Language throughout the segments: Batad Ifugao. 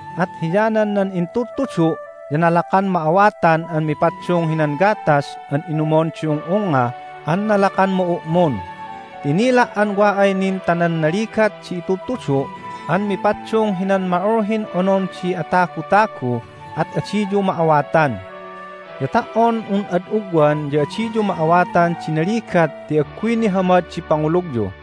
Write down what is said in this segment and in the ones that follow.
At hiyanan nan intudtudu' ya nalakan ma'awatan an mipaddung hinan gatas an inumon di ung'ungnga an nalakan ma'u'mun, ti inila' an wa ay nin ta nan naligat di itudtudu' an mipaddung hinan ma'ulhin onon di atagutagu at adiyu ma'awatan. Ya ta"on un ad ugwan ya adiyu ma'awatan di naligat ti agguy nihamad di pangulugyu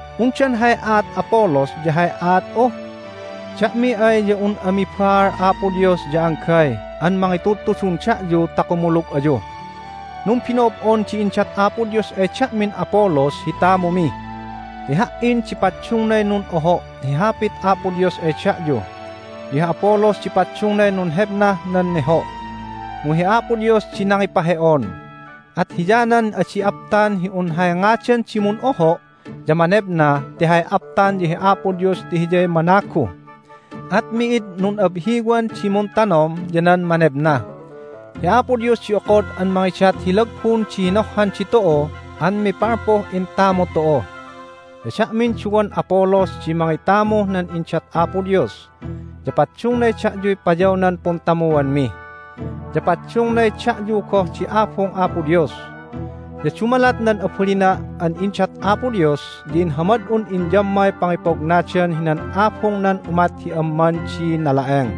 Undan hay aat Apollos ya hay aat'u? Da'mi ay ya un ami baal Apo Dios ya anggay an mangitudtudun da'yu ta kumulug ayu. Numbino'ob'on di indat Apo Dios ay da'min Apollos hi tamumi. Ti ha"in di paddungnay nun'oho' hi Hapit Apo Dios ay da'yu, ya hi Apollos di paddungnay nunhebnah nan neho'. Mu hi Apo Dios di nangipahe'on. At hiyanan adi aptan hi un hay ngadan di mun'oho' ya manebna ti hay aptan ya hi Apo Dios ti Hiyay managu. At mi'id nun'abhiwan di muntanom ya nan manebna. Hi Apo Dios di okod an mangidat hi lagbun di hinohhan ditu'u an mipalpuh intamu tu'u. Ya da'min duwan Apollos di mangitamuh nan indat Apo Dios, ya paddungnay da'yuy payawnan puntamuanmi. Ya paddungnay da'yu goh di abung Apo Dios. Ya dumalat nan abalina' an indat Apo Dios ya inhamad'un inyammay pangipognadan hinan abungnan umat hi amman di nala'eng.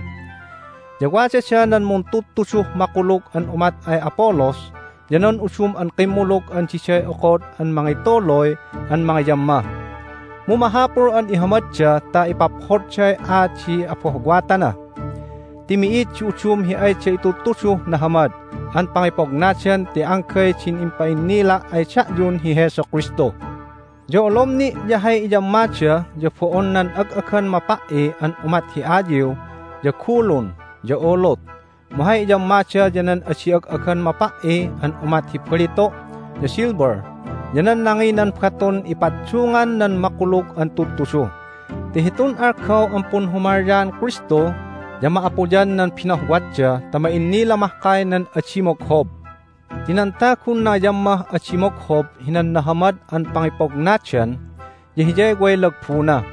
Ya wadada nan muntudtuduh makulug an umat ay Apollos ya nan udum an kimmulug an diday okod an mangituluy an mangiyamma. Mu mahapul an ihamadda ta ipaphodday aat di abohwatana. Ti mi'id di udum hi ayda itudtuduh nahamad an pangipognadan ti anggay din impa'innila' ay da'yun hi Jesu Kristu. Ya olom ni' ya hay iyammada ya bo'on nan ag'agan mapa"i an umat hi ayiw, ya gulun, ya ulut, mu hay iyammada ya nan adi ag'agan mapa"i an umat hi balitu', ya silver, ya nan nanginan batun ipaddungan nan makulug an tudtudu, ti hitun algaw an punhumalyaan Kristu ya ma'apuyan nan binohwatda ta ma'innila mahkay nan adi moghob. Ti nan tagun nangiyammah adi moghob hinan nahamad an pangipognadan ya hiyay way lagbuna.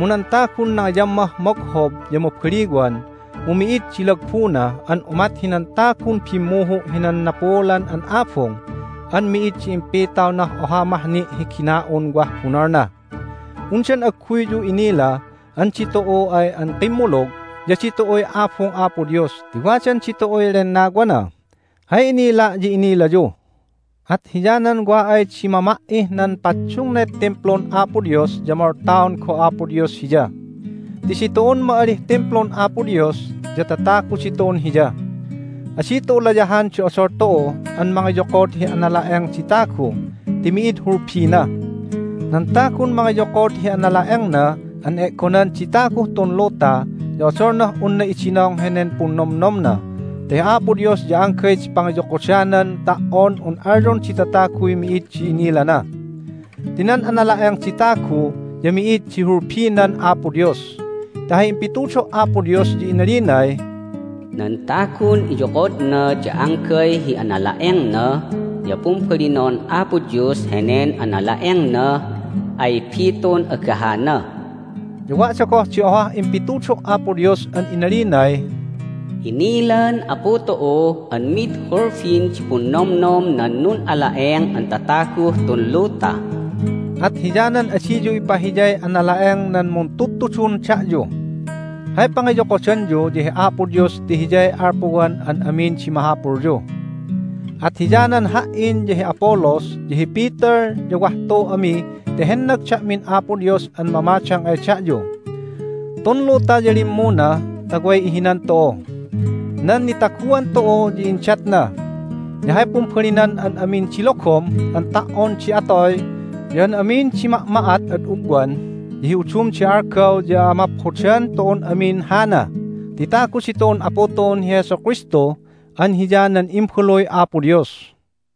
Mu nan tagun nangiyammah moghob ya mabaliwan, mu mi'id di lagbuna an umat hinan tagun bimmuhu' hinan napuulan an abung an mi'id di impitawnah oha mah ni' hi gina'un wah bunolna. Undan agguyyu inila an ditu'u ay an kimmulug ya ditu'uy abung Apo Dios ti wadan ditu'uy Lennawana? Hay inila' ya inilayu! At hiyanan wa ay di mama"ih nan paddungnay Timplun Apo Dios ya moltaon goh Apo Dios hiya. Ti ditu'un ma'alih Timplun Apo Dios, ya tatagu ditu'un Hiya. Adi tu'u layahan di odol tu'u an mangiyokod hi anala'eng di tagu ti mi'id hulbina. Nan tagun mangiyokod hi anala'engna an e'gonan di taguh tun luta ya odolnah unna idinong henen punnomnomna ta hi Apo Dios ya anggay di pangiyokodanan ta"on un alyon di tataguy mi'id di inilana. Ti nan anala'eng di tagu ya mi'id di hulbinan Apo Dios. Ti hay impitudo' Apo Dios ya inalinay, "Nan tagun iyokodna ya anggay hi anala'engna ya pumbalinon Apo Dios henen anala'engnah ay bitun agahana." Ya wada goh di ohah impitudo' Apo Dios an inalinay, "Inilan Apu tu'u an mid hulbin di punnomnom nan nun'ala'eng an tataguh tun luta." At hiyanan adiyu ipahiyay anala'eng nan muntudtudun da'yu. Hay pangiyokodanyu ya hi Apo Dios ti Hiyay alpuwan an amin di mahapulyu. At hiyanan ha"in, ya hi Apollos, ya hi Peter ya wah tu ami ti hennag da'min Apo Dios an mamadang ay da'yu. Tun luta ya limmuna ta way ihinan tu'u. Nan nitaguan tu'u ya indatna. Ya hay pumbalinan an amin di logom an ta"on di atoy, ya an amin di ma'ma'at ad ugwan, ya hi udum di algaw ya amaphodan tu'un amin hana ti tagu ditu'un Apu tu'un hi Jesu Kristu an Hiya nan Imbaluy Apo Dios.